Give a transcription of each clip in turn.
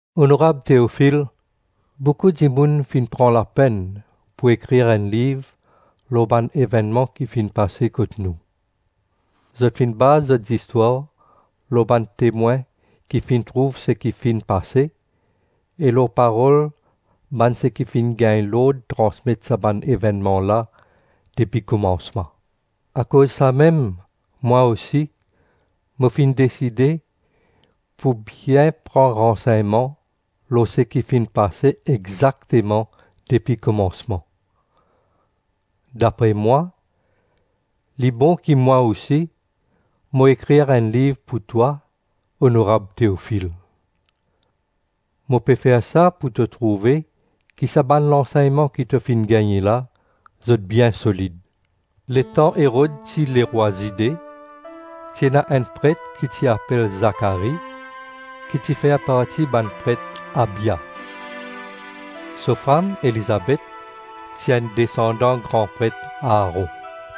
Onorab Teofil: Boukou dimoun finn pran lapenn pou ekrir enn liv lor bann evennman ki finn pase kot nou. Zot finn baz zot zistwar lor bann temwin ki finn trouv seki finn pase, e lor parol bann seki finn gagn lord transmet sa bann evennman la depi komansman. Akoz samem, mwa osi, mo finn deside pou bien pran ransegnman lor seki finn pase exakteman depi komansman. Dapre mwa, li bon ki mwa osi, mo ekrir enn liv pou twa, onorab Teofil. Mo pe fer sa pou to trouve ki sa bann lansegnman ki to finn gagne la, zot bien solid. Letan Erod ti lerwa Zide, ti ena enn pret ki ti apel Zakari, ki ti fer parti bann pret Abia; so fam Elizabet ti enn desandan gran pret Aaron.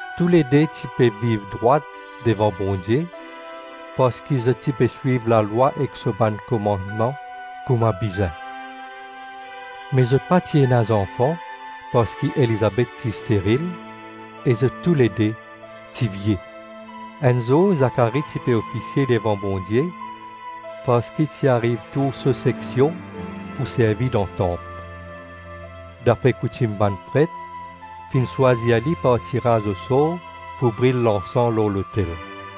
Toulede ti pe viv drwat devan Bondie, parski zot ti pe swiv lalwa ek so bann komannman kouma bizin. Me zot pa ti ena zanfan parski Elizabet ti steril, e zot toulede ti vie. Enn zour Zakari ti pe ofisie devan Bondie parski ti ariv tour so seksion pou servi dan tanp. Dapre koutim bann pret, finn swazir li par tiraz osor pou bril lansan lor lotel.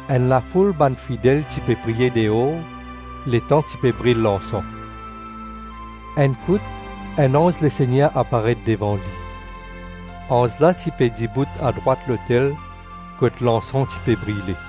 Enn lafoul bann fidel ti pe priye deor letan ti pe bril lansan. Enn kout, enn anz Lesegner aparet devan li. Anz la ti pe dibout adrwat lotel kot lansan ti pe brile.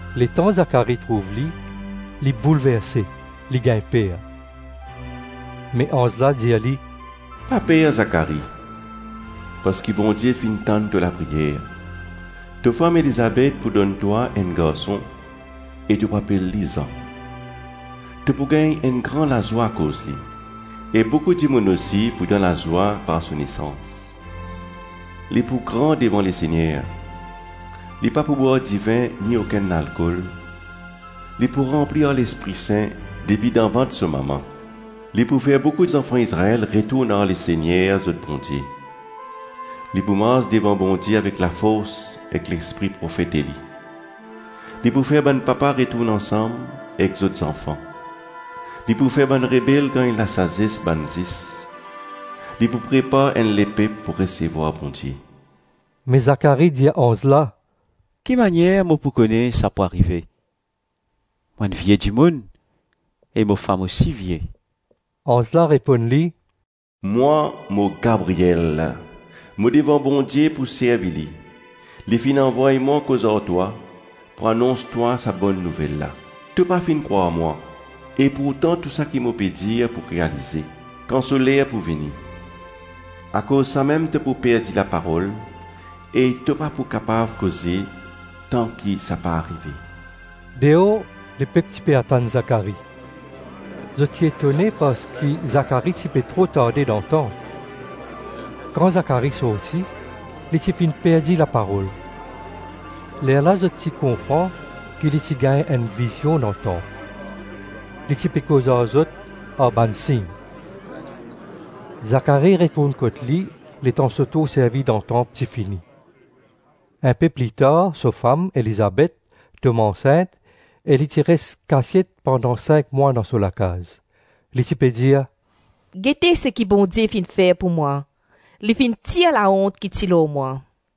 Letan Zakari trouv li, li boulverse, li gagn per. Me anz la dir li, “Pa per, Zakari, parski Bondie finn tann to lapriyer. To fam Elizabet pou donn twa enn garson e to pou apel li Zan. To pou gagn enn gran lazwa akoz li, e boukou dimoun osi pou dan lazwa par so nesans. Li pou gran devan Lesegner. Li pa pou bwar divin ni okenn lalkol. Li pou ranpli ar Lespri Sin depi dan vant so mama. Li pou fer boukou zanfan Izrael retourn ar Lesegner zot Bondie. Li pou mars devan Bondie avek lafors ek lespri profet Eli. Li pou fer bann papa retourn ansam ek zot zanfan. Li pou fer bann rebel gagn lasazes bann zis. Li pou prepar enn lepep pou resevwar Bondie.” Me Zakari dir anz la, “Ki manier mo pou kone sa pou arive? Mo enn vie dimoun e mo fam osi vie.” Anz la reponn li, “Mwa, mo Gabriel; mo devan Bondie pou servi li; li finn avoy mwa koz ar twa, pou anons twa sa bonn nouvel la. To pa finn krwar mwa, e pourtan tou seki mo pe dir pou realize, kan so ler pou vini. Akoz samem to pou perdi laparol e to pa pou kapav koze tanki sa pa arive.” Deor, lepep ti pe atann Zakari. Zot ti etone parski Zakari ti pe tro tarde dan tanp. Kan Zakari sorti, li ti finn perdi laparol. Lerla zot ti konpran ki li ti gagn enn vizion dan tanp. Li ti pe koz ar zot ar bann sign. Zakari retourn kot li letan so tour servi dan tanp ti fini. Inpe plitar so fam, Elizabet, tom ansint e li ti res kasiet pandan sink mwa dan so lakaz. Li ti pe dir, “Gete seki Bondie finn fer pou mwa, li finn tir laont ki ti lor mwa.”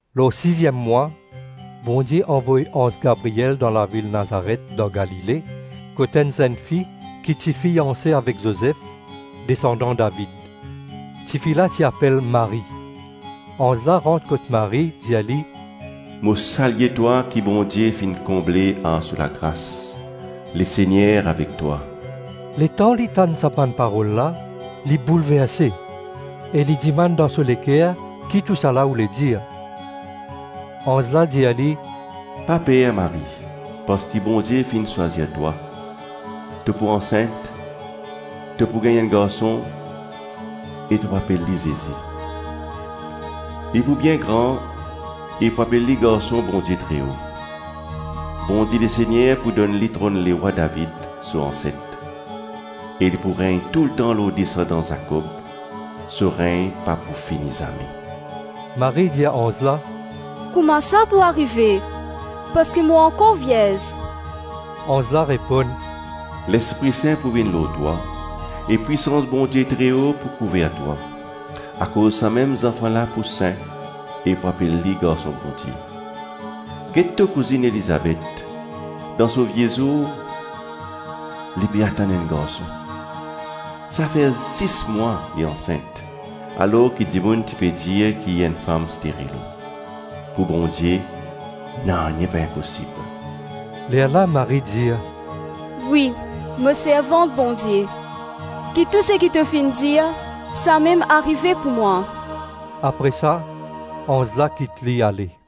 Lor siziem mwa, Bondie avoy anz Gabriel dan lavil Nazaret dan Galile, kot enn zennfi ki ti fianse avek Zozef, desandan David. Tifi la ti apel Marie. Anz la rant kot Marie, dir li, “Mo salye twa ki Bondie finn konble ar so lagras. Lesegner avek twa.” Letan li tann sa bann parol la, li boulverse e li dimann dan so leker ki tousala oule dir. Anz la dir li, “Pa per, Marie, parski Bondie finn swazir twa. To pou ansint, to pou gagn enn garson, e to pou apel li Zezi. Li pou bien gran e pou apel li Garson Bondie Treo. Bondie Lesegner pou donn li tronn lerwa David, so anset, e li pou regn toultan lor desandan Zakob; so regn pa pou fini zame.” Marie dir anz la, “Kouma sa pou arive, parski mo ankor vierz?” Anz la reponn, “Lespri Sin pou vinn lor twa, e pwisans Bondie Treo pou kouver twa; akoz samem zanfan la pou Sin e pou apel li Garson Bondie. Get to kouzinn Elizabet, dan so vie zour, li pe atann enn garson. Sa fer sis mwa li ansint, alors ki dimoun ti pe dir ki li enn fam steril. Pou Bondie, nanye pa inposib.” Lerla Marie dir, “Wi, mo servant Bondie. Ki tou seki to finn dir, samem arive pou mwa!” Apre sa, anz la kit li, ale.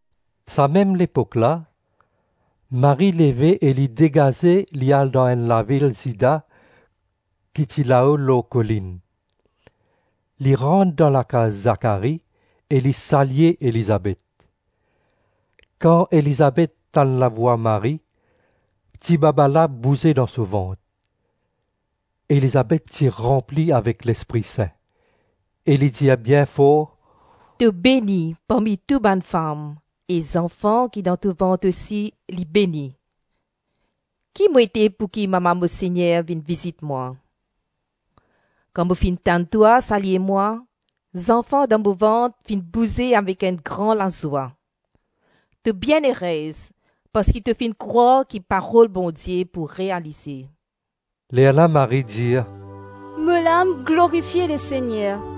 Samem lepok la, Marie leve e li degaze li al dan enn lavil Zida ki ti lao lor kolinn. Li rant dan lakaz Zakari e li salye Elizabet. Kan Elizabet tann lavwa Marie, tibaba la bouze dan so vant. Elizabet ti ranpli avek Lespri Sin e li dir bien for, “To beni parmi tou bann fam e zanfan ki dan to vant osi, li beni. Ki mo ete pouki mama mo Segner vinn vizit mwa? Kan mo finn tann twa salye mwa, zanfan dan mo vant finn bouze avek enn gran lazwa. To bienerez parski to finn krwar ki parol Bondie pou realize.” Lerla Marie dir, “Mo lam glorifie Lesegner,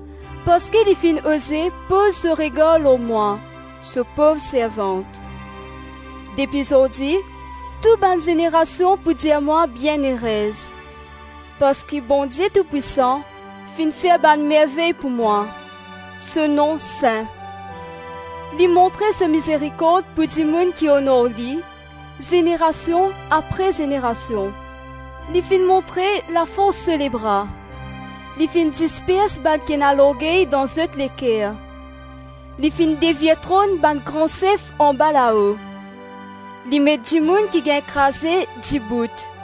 parski li finn oze poz so regar lor mwa, so pov servant. Depi zordi tou bann zenerasion pou dir mwa bienerez, parski Bondie Toupwisan finn fer bann mervey pou mwa. So nom sin. Li montre so mizerikord pou dimoun ki onor li, zenerasion apre zenerasion. Li finn montre lafors so lebra; Li finn dispers bann ki ena lorgey dan zot leker. Li finn devir tronn bann gran sef anbalao. Li met dimoun ki gagn kraze dibout;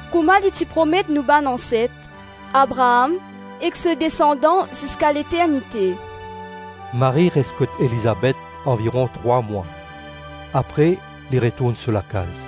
kouma li ti promet nou bann anset, Abraam ek so desandan ziska leternite.” Marie res kot Elizabet anviron trwa mwa, apre li retourn so lakaz.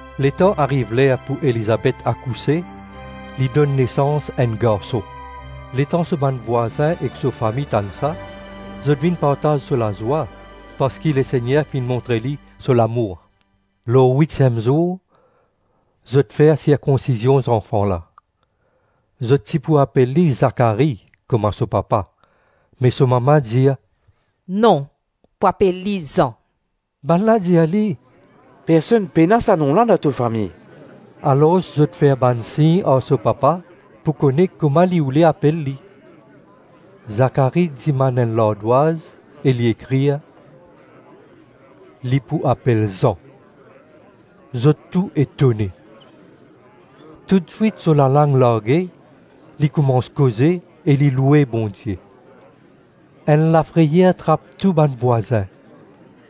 Letan ariv ler pou Elizabet akouse, li donn nesans enn garson. Letan so bann vwazin ek so fami tann sa, zot vinn partaz so lazwa parski Lesegner finn montre li so lamour. Lor witiem zour, zot fer sirkonsizion zanfan la; zot ti pou apel li Zakari kouma so papa, me so mama dir, “Non. Pou apel li Zan.” Bannla dir li, “Personn pena sa nom la dan to fami.” Alors zot fer bann sign ar so papa pou kone kouma li ti oule apel li. Zakari dimann enn lardwaz e li ekrir, “Li pou apel Zan.” Zot tou etone. Toutswit so lalang large, li koumans koze, ek li loue Bondie. Enn lafreyer trap tou bann vwazin,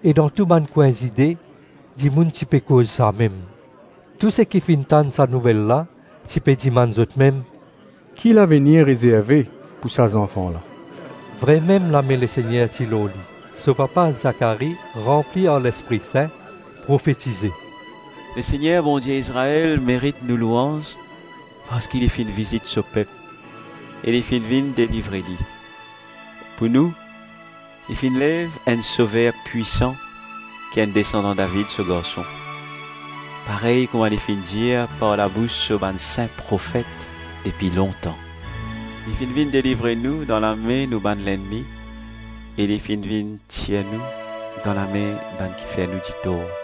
e dan tou bann kwin Zide dimoun ti pe koz samem. Tou seki finn tann sa nouvel la ti pe dimann zotmem, “Ki lavenir rezerve pou sa zanfan la?” Vremem lame Lesegner ti lor li. So papa Zakari ranpli ar Lespri Sin, profetize, “Lesegner Bondie Izrael merit nou louanz parski li finn vizit so pep e li finn vinn delivre li. Pou nou, li finn lev enn Sover pwisan ki enn desandan David, so garson; parey kouma li finn dir par labous so bann sin profet depi lontan. Li finn vinn delivre nou dan lame nou bann lennmi e li finn vinn tir nou dan lame bann ki fer nou ditor.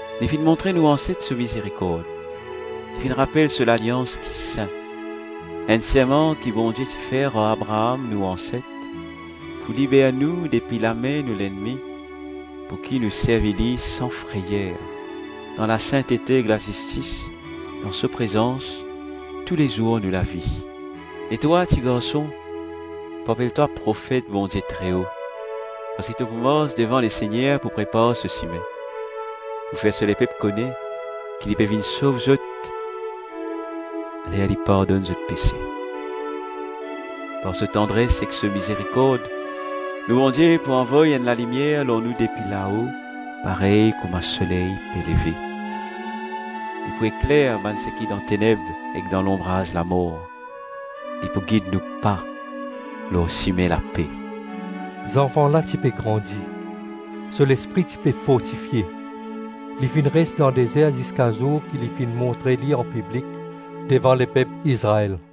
Li finn montre nou anset so mizerikord, li finn rapel so lalians ki sin, enn serman ki Bondie ti fer ar Abraam, nou anset, pou liber nou depi lame nou lennmi, pouki nou servi li san freyer, dan lasintete ek lazistis dan so prezans tou lezour nou lavi. E twa, tigarson, pou apel twa profet Bondie Treo, parski to pou mars devan Lesegner pou prepar so sime, pou fer so lepep kone ki li pe vinn sov zot ler li pardonn zot pese. Par so tandres ek so mizerikord, nou Bondie pou avoy enn lalimier lor nou depi lao parey kouma soley pe leve. Li pou ekler bann seki dan teneb ek dan lonbraz lamor. Li pou gid nou pa lor sime lape.” Zanfan la ti pe grandi, so lespri ti pe fortifie. Li finn res dan dezer ziska zour ki li finn montre li anpiblik devan lepep Izrael.